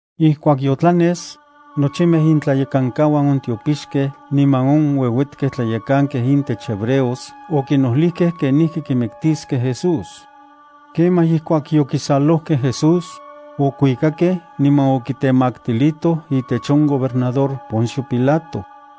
Ijkuak yotlanes, nochimej intlayekankauan on tiopixkej niman on ueuetkej tlayekankej intech hebreos okinojlijkej kenijki kimiktiskej Jesús. Kemaj ijkuak yokisalojkej Jesús, okuikakej niman okitemaktilitoj itech on gobernador Poncio Pilato.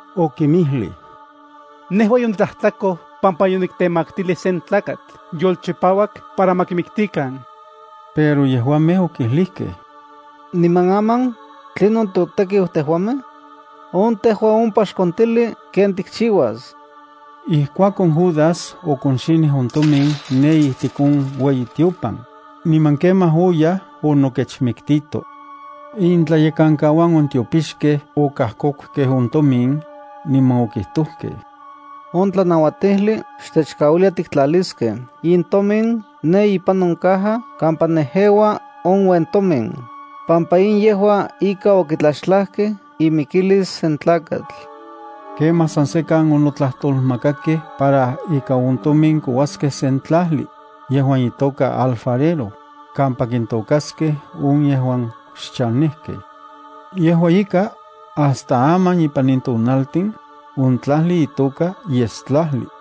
Okinmijlij: —Nejua yonitlajtlakoj pampa yoniktemaktilij sen tlakatl yolchipauak para ma kimiktikan. Pero yejuamej okijlijkej: —Niman aman, ¿tlinon totekiu tejuamej? ¡On, tejua ompa xkontili ken tikchiuas! Ijkuakon Judas okonxinij on tomin ne ijtik on ueyitiopan, niman kemaj oyaj onokechmiktito. Intlayekankauan on tiopixkej okajkokukej on tomin, niman okijtojkej: —On tlanauatijli xtechkauilia tiktlaliskej in tomin ne ipan on caja kampa nejeua on uentomin, pampa in yejua ika okitlaxtlajkej imikilis sen tlakatl. Kemaj san sekan onotlajtolmakakej para ika on tomin kouaskej sen tlajli, yejuan itoka Alfarero, kampa kintokaskej on yejuan xchanejkej. Yejua ika, hasta aman ipan in tonaltin, on tlajli itoka Yestlajli.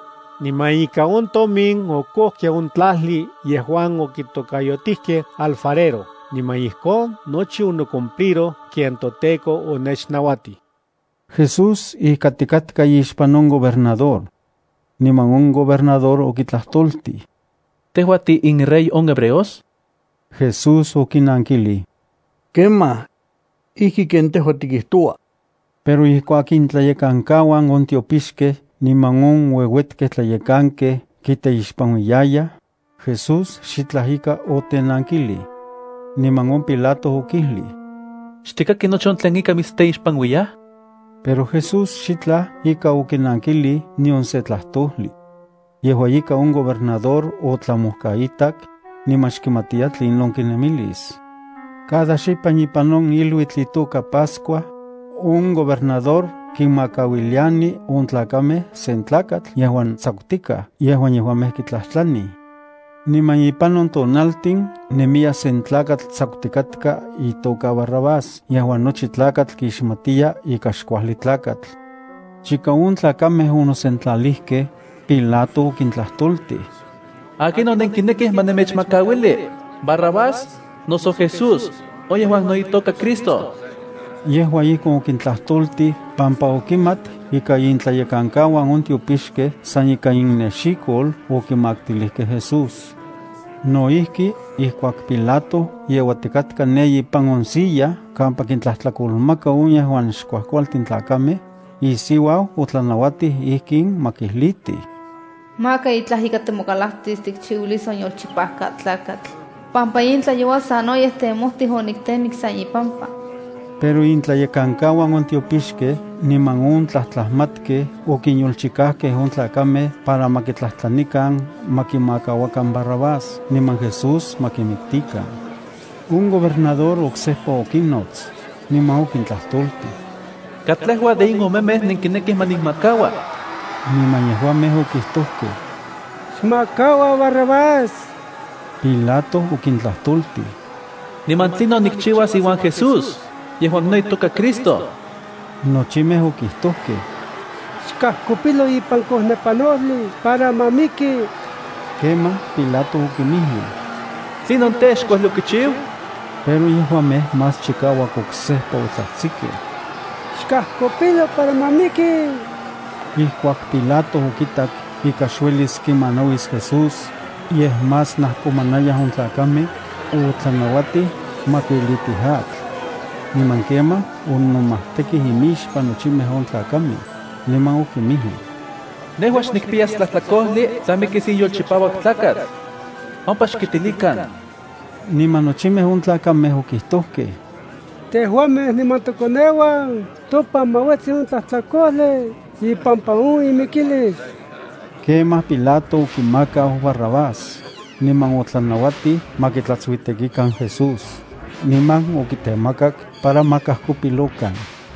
Niman ika on tomin okojkej on tlajli yejuan okitokayotijkej Alfarero niman ijkon nochi onocumpliroj ken toTEKO onechnauatij.” Jesús ijkatikatka ixpan on gobernador. Niman on gobernador okitlajtoltij: —¿Tejua tiinRey on hebreos? Jesús okinankilij: —Kemaj. Ijki ken tejua tikijtoua. Pero ijkuak intlayekankauan on tiopixkej niman on ueuetkej tlayekankej kiteixpanuiyayaj, Jesús xitlaj ika otenankilij. Niman on Pilato okijlij: —¿Xtikaki nochi on tlen ika mitsteixpanuiyaj? Pero Jesús xitlaj ika okinankilij nion se tlajtojli. Yejua ika on gobernador otlamojkaitak, niman xkimatiya tlinon kinemilis. Cada xipan ipan on iluitl itoka Pascua, on gobernador kinmakauiliani on tlakamej sen tlakatl yejuan tsakutikaj yejuan yejuamej kitlajtlanij. Niman ipan on tonaltin nemiya sen tlakatl tsakutikatka itoka Barrabás yejuan nochi tlakatl kixmatiya ika xkuajli tlakatl. Chika on tlakamej onosentlalijkej, Pilato okintlajtoltij: —¿Akinon nenkinekij ma nemechmakauili: Barrabás, noso Jesús, on yejuan no itoka Cristo? Yejua ijkon okintlajtoltij pampa okimat ika intlayekankauan on tiopixkej san ikan innexikol okimaktilijkej Jesús. No ijki, ijkuak Pilato yeuatikatka ne ipan on silla kampa kintlajtlakolmaka on yejuan xkuajkualtin tlakamej, isiuau otlanauatij ijkin ma kijlitij: “Maka itlaj ika timokalaktis tikchiuilis on yolchipauak tlakatl, pampa in tlayoua sanoyej temojtij oniktemik san ipampa.” Pero intlayekankauan on tiopixkej niman on tlajtlajmatkej okinyolchikajkej on tlakamej para ma tlajtlanikan ma kimakauakan Barrabás, niman Jesús ma kimiktikan. On gobernador oksejpa okinnots, niman okintlajtoltij: —¿Katlejua de in omemej nenkinekij ma nikmakaua? Niman yejuamej okijtojkej: —¡Xmakaua Barrabás! Pilato okintlajtoltij: —¿Niman tlinon nikchiuas iuan Jesús, yejuan no itoka Cristo? Nochimej okijtojkej: —¡Xkajkopilo ipan kojnepanojli para ma miki! Kemaj Pilato okinmijlij: —¿Tlinon tej, xkuajli okichiu? Pero yejuamej más chikauak oksejpa otsajtsikej: —¡Xajkopilo para ma miki! Ijkuak Pilato okitak ika xuelis kimanauis Jesús, yej más najkomanayaj on tlakamej, otlanauatij ma kuilitij atl. Niman kemaj onomajtekij imixpan nochimej on tlakamej, niman okinmijlij: —Nejua xnikpiyas tlajtlakojli tla mikis in yolchipauak tlakatl. Ompa xkitilikan. Niman nochimej on tlakamej okijtojkej: —¡Tejuamej niman tokoneuan topan ma uetsi on tlajtlakojli ipampa on imikilis! Kemaj Pilato okimakau Barrabás, niman otlanauatij ma kitlatsuitekikan Jesús, niman okitemakak para ma kajkopilokan.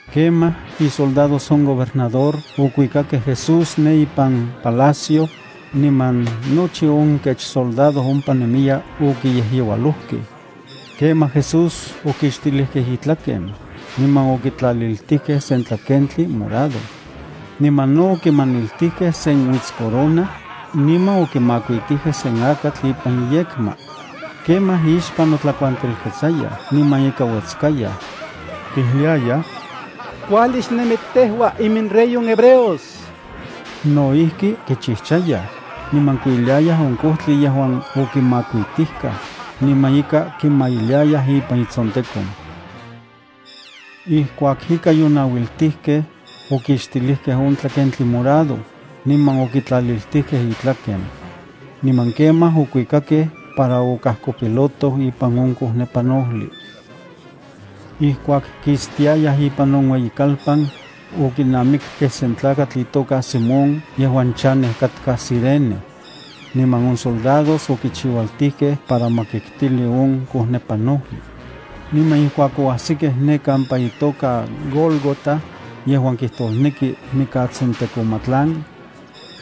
Kemaj isoldados on gobernador okuikakej Jesús ne ipan palacio, niman nochi on kech soldado ompa nemiya okiyejyeualojkej. Kemaj Jesús okixtilijkej itlaken, niman okitlaliltijkej se tlakentli morado. Niman no okimaniltijkej sen uitscorona, niman okimakuitijkej sen akatl ipan iyekma. Kemaj ixpan notlakuantelketsayaj niman ika uetskayaj. Kijliayaj: —¡Kuajli xnemi tejua iminRey on hebreos! No ijki kichijchayaj, niman kuiliayaj on kojtli yejuan okimakuitijkaj, niman ika kimailiayaj ipan itsontekon. Ijkuak ika yonauiltijkej, okixtilijkej on tlakentli morado, niman okitlaliltijkej itlaken. Niman kemaj okuikakej para okajkopilotoj ipan on kojnepanojli. Ijkuak kistiayaj ipan on ueyikalpan, okinamikkej sen tlakatl itoka Simón yejuan chanej katka Cirene. Niman on soldados okichiualtijkej para ma kiktili on kojnepanojli. Niman ijkuak oajsikej ne kampa itoka Gólgota, yejuan kijtosneki “Mikatsontekomatlan”,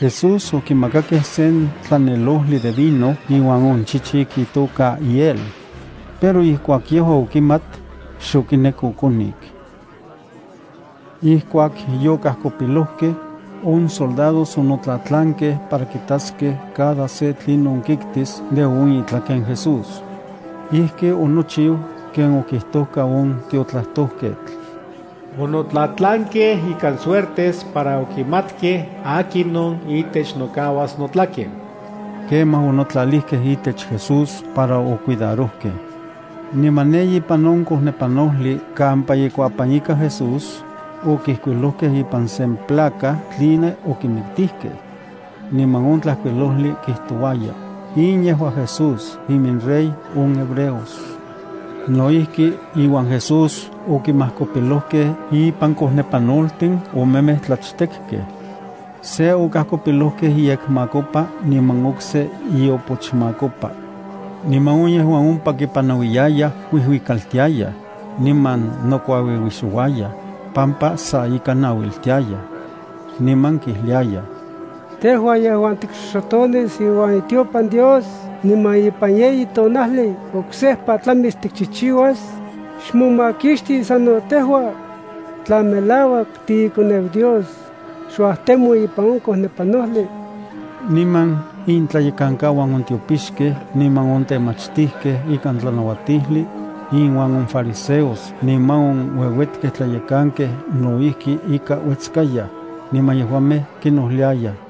Jesús okimakakej sen tlanelojli de vino iuan on chichik itoka hiel. Pero ijkuak yejua okimat, xokinek okonik. Ijkuak yokajkopilojkej, on soldados onotlatlankej para kitaskej cada se tlinon kiktis de on itlaken Jesús. Ijki onochiu ken okijtoka on tiotlajtojketl: “Onotlatlankej ikan suertes para okimatkej akinon itech nokauas notlaken.” Kemaj onotlajtlalijkej itech Jesús para ocuidarojkej. Niman ne ipan on kojnepanojli kampa ikuapan ika Jesús, okijkuilojkej ipan sen placa tline okimiktijkej. Niman on tlajkuilojli kijtouaya: “In yejua Jesús, iminRey on hebreos.” No ijki, iuan Jesús okinmajkopilojkej impan kojnepanoltin omemej tlachtekej. Se okajkopilojkej iyekmakopa niman okse iopochmakopa. Niman on yejuan ompa kipanauiyayaj kuijuikaltiayaj, niman nokuauiuixouayaj, pampa sa ika nauiltiayaj. Niman kijliayaj: —Tejua yejuan tikxoxotonis iueyitiopan Dios niman ipan yeyi tonajli oksejpa tlamis tikchijchiuas, xmomakixti sano tejua. Tla melauak tiiKoneu Dios, xuajtemo ipan on kojnepanojli. Niman intlayekankauan on tiopixkej niman on temachtijkej ikan tlanauatijli, inuan on fariseos niman on ueuetkej tlayekankej no ijki ika uetskayaj, niman yejuamej kinojliayaj: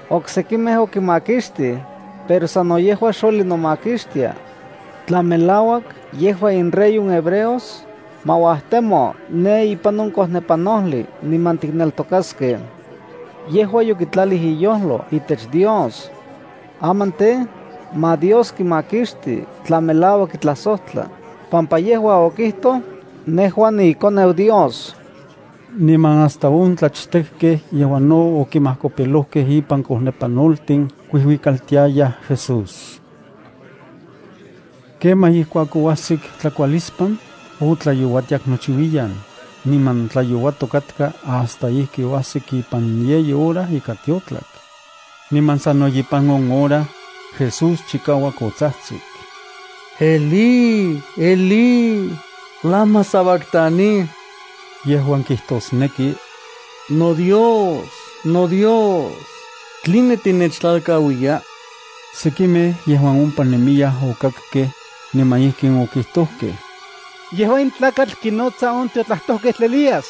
—Oksekimej okinmakixtij, pero sano yejua xueli nomakixtia. Tla melauak yejua inRey on hebreos, ma uajtemo ne ipan on kojnepanojli niman tikneltokaskej. Yejua yokitlalij iyojlo itech Dios. Aman tej, ma Dios kimakixti tla melauak kitlajsojtla, pampa yejua okijtoj: “Nejua niiKoneu Dios.” Niman hasta on tlachtekkej yejuan no okinmajkopilokej impan kojnepanoltin kuijuikaltiayaj Jesús. Kemaj ijkuak oajsik tlakualispan, otlayouatiak nochiuiyan, niman tlayouatok katka hasta ijki oajsik ipan yeyi hora ika tiotlak. Niman sano ipan on hora, Jesús chikauak otsajtsik: —Elí, Elí, ¿lama sabactani? —yejuan kijtosneki: noDios, noDios, ¿tline tinechtlalkauiya? Sekimej yejuan ompa nemiyaj okakkej, niman ijkin okijtojkej: —Yejua in tlakatl kinotsa on tiotlajtojketl Elías.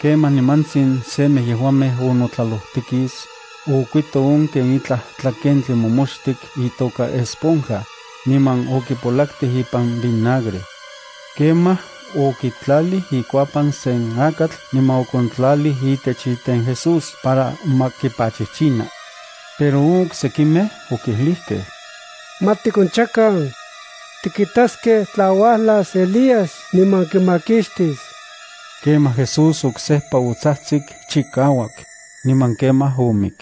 Kemaj nimantsin semej yejuamej onotlalojtikis, okuito on ken itlaj tlakentli momoxtik itoka esponja, niman okipolaktij ipan vinagre. Kemaj okitlalij ikuapan sen akatl niman okontlalij itech iten Jesús para ma kipachichina. Pero on oksekimej okijlijkej: —Ma tikonchakan. Tikitaskej tla uajlas Elías niman kimakixtis. Kemaj Jesús oksejpa otsajtsik chikauak, niman kemaj omik.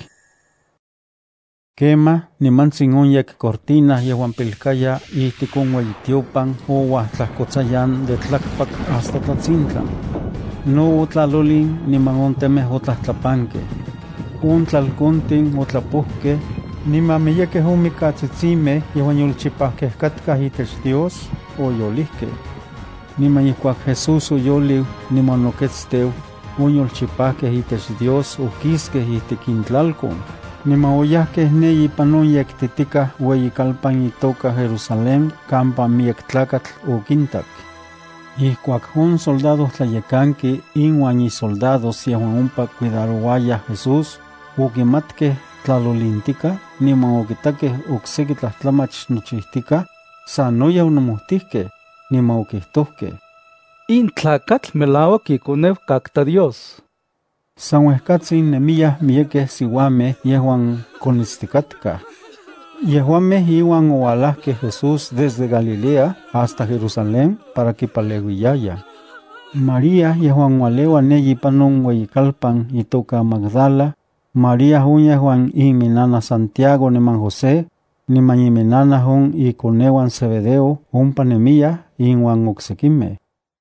Kemaj nimantsin on yekcortina yejuan pilkaya ijtik on ueyitiopan ouajtlajkotsayan de tlakpak hasta tlatsintlan. No otlalolin niman on temej otlajtlapankej. On tlalkontin otlapojkej, niman miyekej on mikatsitsimej yejuan yolchipajkej katkaj itech Dios oyolijkej. Niman ijkuak Jesús oyoliu niman onoketsteu, on yolchipajkej itech Dios okiskej ijtik intlalkon, niman oyajkej ne ipan on yektitikaj ueyikalpan itoka Jerusalén kampa miyek tlakatl okintak. Ijkuak on soldadojtlayekanki inuan isoldados yejuan ompa cuidarouayaj Jesús, okimatkej tlalolintikaj niman okitakej okseki tlajtlamach nochijtikaj, sanoyej onomojtijkej, niman okijtojkej: —In tlakatl melauak iKoneu katka Dios. San uejkatsin nemiyaj miyekej siuamej yejuan konitstikatkaj. Yejuamej iuan ouajlakej Jesús desde Galilea hasta Jerusalén para kipaleuiyayaj. María yejuan ualeua ne ipan on ueyikalpan itoka Magdala, María on yejuan iminnanaj Santiago niman José, niman iminnanaj on ikoneuan Zebedeo ompa nemiyaj inuan oksekimej.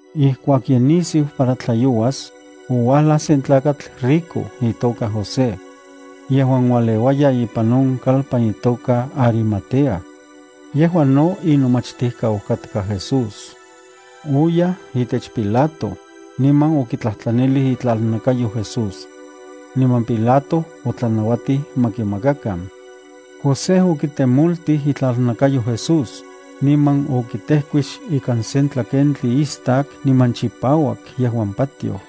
Ijkuak ye nisiu para tlayouas, ouajlaj sen tlakatl rico itoka José. Yejuan ualeuaya ipan on kalpan itoka Arimatea. Yejua no inomachtijkau katka Jesús. Oyaj itech Pilato, niman okitlajtlanilij itlalnakayo Jesús. Niman Pilato otlanauatij ma kimakakan. José okitemoltij itlalnakayo Jesús, niman okitejkuix ikan sen tlakentli istak niman chipauak yejuan patioj.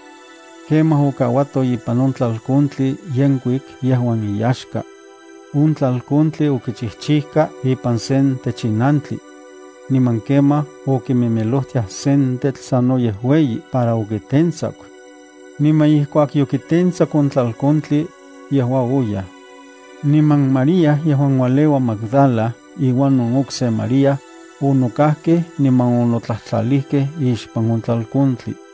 Kemaj okauato ipan on tlalkontli yenkuik yejuan iyaxka. On tlalkontli okichijchijka ipan sen techinantli. Niman kemaj okimimilojtiaj sen tetl sanoyej ueyi para okitentsaku. Niman ijkuak yokitentsaku on tlalkontli, oyaj. Niman María yejuan ualeua Magdala iuan on okse María, onokajkej niman onotlajtlalijkej ixpan on tlalkontli.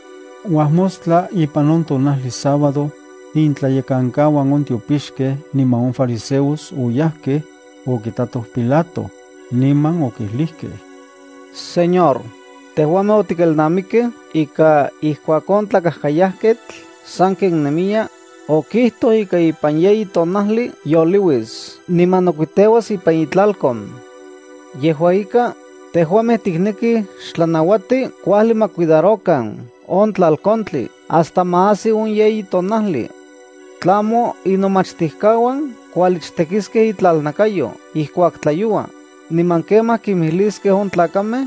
Uajmostla, ipan on tonajli sábado, intlayekankauan on tiopixkej niman on fariseos oyajkej, okitatoj Pilato, niman okijlijkej: —Señor, tejuamej otikelnamikej ika ijkuak on tlakajkayajketl sanken nemiya, okijtoj ika ipan yeyi tonajli youliuis niman noketsteuas ipan itlalkon. Yejua ika, tejuamej tiknekij xtlanauati kuajli ma cuidarokan on tlalkontli hasta ma ajsi on yeyi tonajli. Tlamo inomachtijkauan kualichtekiskej itlalnakayo ijkuak tlayoua, niman kemaj kimijliskej on tlakamej: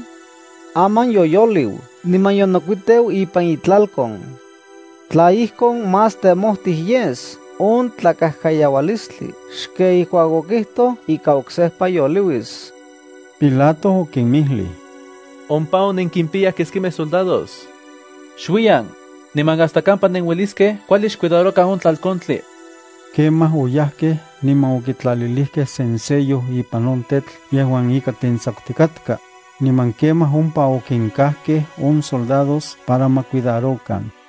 “Aman yoyoliu niman yonokuiteu ipan itlalkon.” Tla ijkon más temojtij yes on tlakajkayaualistli xken ijkuak okijtoj ika oksejpa yoliuis. Pilato okinmijlij: —Ompa on nenkimpiyaj keskimej soldados. Xuiyan, niman hasta kampa nenueliskej kuajli xcuidarokan on tlalkontli. Kemaj oyajkej niman okitlalilijkej sen sello ipan on tetl yejuan ika tentsakutikatka, niman kemaj ompa okinkajkej on soldados para ma cuidarokan.